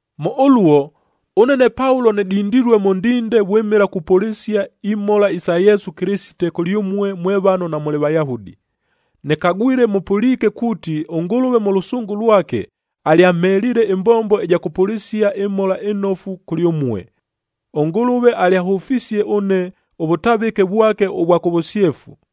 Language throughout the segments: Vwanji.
Mʉ ʉluo, ʉne ne Paulo nɨdindilue mʉ ndinde vwɨmɨla kupʉlɨsia imhola isa Yesu Kɨlɨsite kʉlyʉmue mwe vano namʉlɨ Vayahudi. Nɨkagwile mʉpʉliike kuuti ʉNgʉlʉve mʉ lʉsʉngʉ lwake, alyamheliile ɨmbombo ɨja kʉpʉlɨsia ɨMhola ɨNofu kʉlyʉmue. ɄNgʉlʉve alyahʉfisie ʉne ʉvʉtavɨke vwake ʉvwa kʉ vʉsyefu,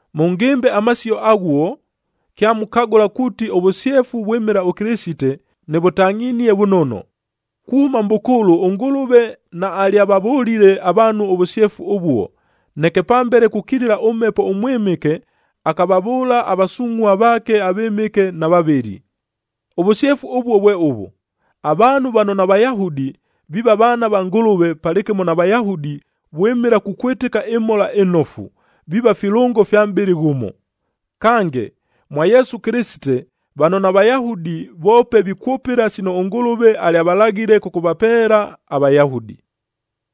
Mʉngɨmbe amasio aghuo, kyamukagʉla kuuti ʉvʉsyefu vwɨmɨla ʉKɨlɨsite, nɨvʉtangʼhinie vʉnono. Kuhʉma mʼbʉkʉʉlʉ ʉNgʉlʉve naalyavavʉlile avaanhu ʉvʉsyefu ʉvuo, neke pambele kukilila ʉMhepo ʉMwɨmɨke akavavʉʉla avasungʼhua vaake avɨmɨke na vavɨli. Ʉvʉsyefu ʉvuo vwe ʉvʉ: Avaanhu vano naVayahudi viiva vaana va Ngʉlʉve palɨkɨmo na Vayahudi vwɨmɨla kukwɨtɨka ɨMhola ɨNofu, viiva filʉngo fya mʼbɨlɨ ghʉmo. Kange, mwa Yesu Kɨlɨsite, vano naVayahudi voope vikwʉpɨla sino ʉNgʉlʉve alyavalaghile kʉkʉvapeela aVayahudi.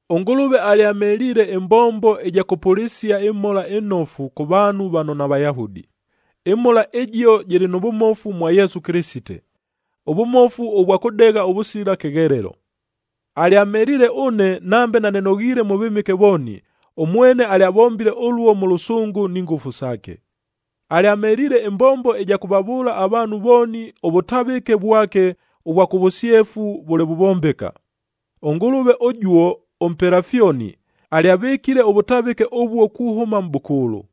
ɄNgʉlʉve alyamheliile ɨmbombo ɨja kʉpʉlɨsia ɨMhola ɨNofu kʉ vaanhu vano naVayahudi. ƗMhola ɨjio jɨlɨ nʉ vʉmofu mwa Yesu Kɨlɨsite, ʉvʉmofu ʉvwa kʉdegha ʉvʉsila kɨghelelo. Alyamheliile ʉne nambe nanɨnoghiile mʉ vɨmɨke vooni, ʉmwene alyavombile ʉluo mʉ lʉsʉngʉ ni ngʉfu saake. Alyamheliile ɨmbombo ɨja kʉvavʉʉla avaanhu vooni ʉvʉtavɨke vwake ʉvwa kʉ vʉsyefu vʉle vuvombeka. ɄNgʉlʉve ʉjuo ʉmpela fyoni, alyavɨkile ʉvʉtavɨke ʉvuo kuhʉma mʼbʉkʉʉlʉ.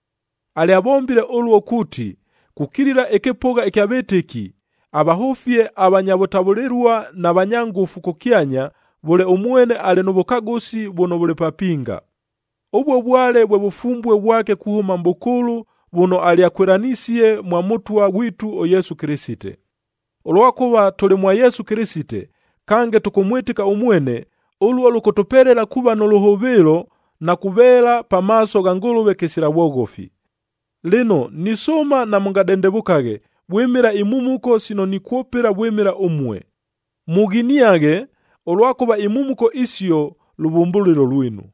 Alyavombile ʉluo kuuti, kukilila ɨkɨpʉgha ɨkya vɨtɨki, avahʉfie avanya vʉtavʉlɨlua na vanya ngʉfu kʉkyanya vʉle ʉmwene alɨ nʉ vʉkagʉsi vʉno vʉlɨ papinga. Ʉvuo vwale vwe vʉfumbue vwake kuhʉma mʼbʉkʉʉlʉ vʉno alyakwɨlanisie mwa Mʉtwa ghwitu ʉYesu Kɨlɨsite. Ʉlwakʉva tʉlɨ mwa Yesu Kɨlɨsite, kange tʉkʉmwɨtɨka ʉmwene, ʉluo lʉkʉtʉpelela kuuva nʉ lʉhʉvɨɨlo na kuveela pamaaso gha Ngʉlʉve kɨsila vwoghofi. Lɨno, nisʉʉma namʉngadendevʉkaghe vwɨmɨla imhumuko sino nikwʉpɨla vwɨmɨla ʉmue. Mughiniaghe, ʉlwakʉva imhumuko isio lʉvʉmbʉlɨlo lwinu.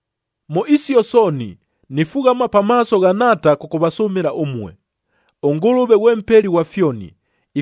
Mʉ isio sooni, nifughama pamaaso gha Nhaata kʉkʉvasʉmɨla ʉmue. ɄNgʉlʉve ghwe Mpeli ghwa fyoni,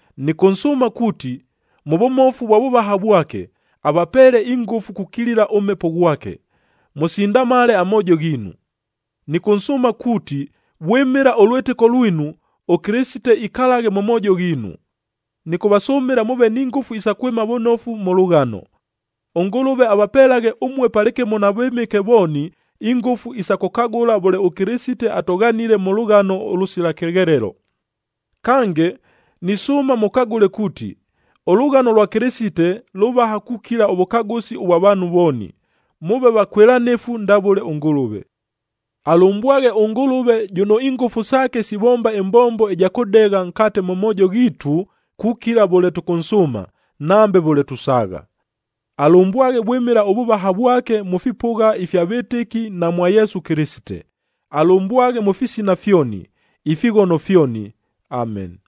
Nɨkʉnsʉʉma kuuti, mʉ vʉmofu vwa vʉvaha vwake, avapeele ingʉfu kukilila ʉMhepo ghwake, mʉsindamale amoojo ghiinu. Nɨkʉnsʉʉma kuuti vwɨmɨla ʉlwɨtɨko lwinu, ʉKɨlɨsite ikalaghe mʉ moojo ghiinu. Nɨkʉvasʉmɨla mʉʉve ni ngʉfu isa kwɨma vʉnofu mʉ lʉghano. ɄNgʉlʉve avapelaghe ʉmue palɨkɨmo na vɨmɨke vooni ingʉfu isa kʉkagʉla vʉle ʉKɨlɨsite atʉghanile mʉ lʉghano ʉlʉsila kɨghelelo. Kange, nisʉʉma mʉkagʉle kuuti, ʉlʉghano lwa Kɨlɨsite lʉvaha kukila ʉvʉkagʉsi ʉvwa vaanhu vooni, mʉʉve vakwɨlanɨfu ndavʉle ʉNgʉlʉve. Alʉmbwaghe ʉNgʉlʉve jʉno ingʉfu saake sivomba ɨmbombo ɨja kʉdegha nkate mʉ moojo ghiitu kukila vʉle tʉkʉnsʉʉma, nambe vʉle tusaagha! Alʉmbwaghe vwɨmɨla ʉvʉvaha vwake mʉ fipʉgha ifya vɨtɨki na mwa Yesu Kɨlɨsite. Alʉmbwaghe mʉ fisina fyoni, ifighono fyoni! Ameni.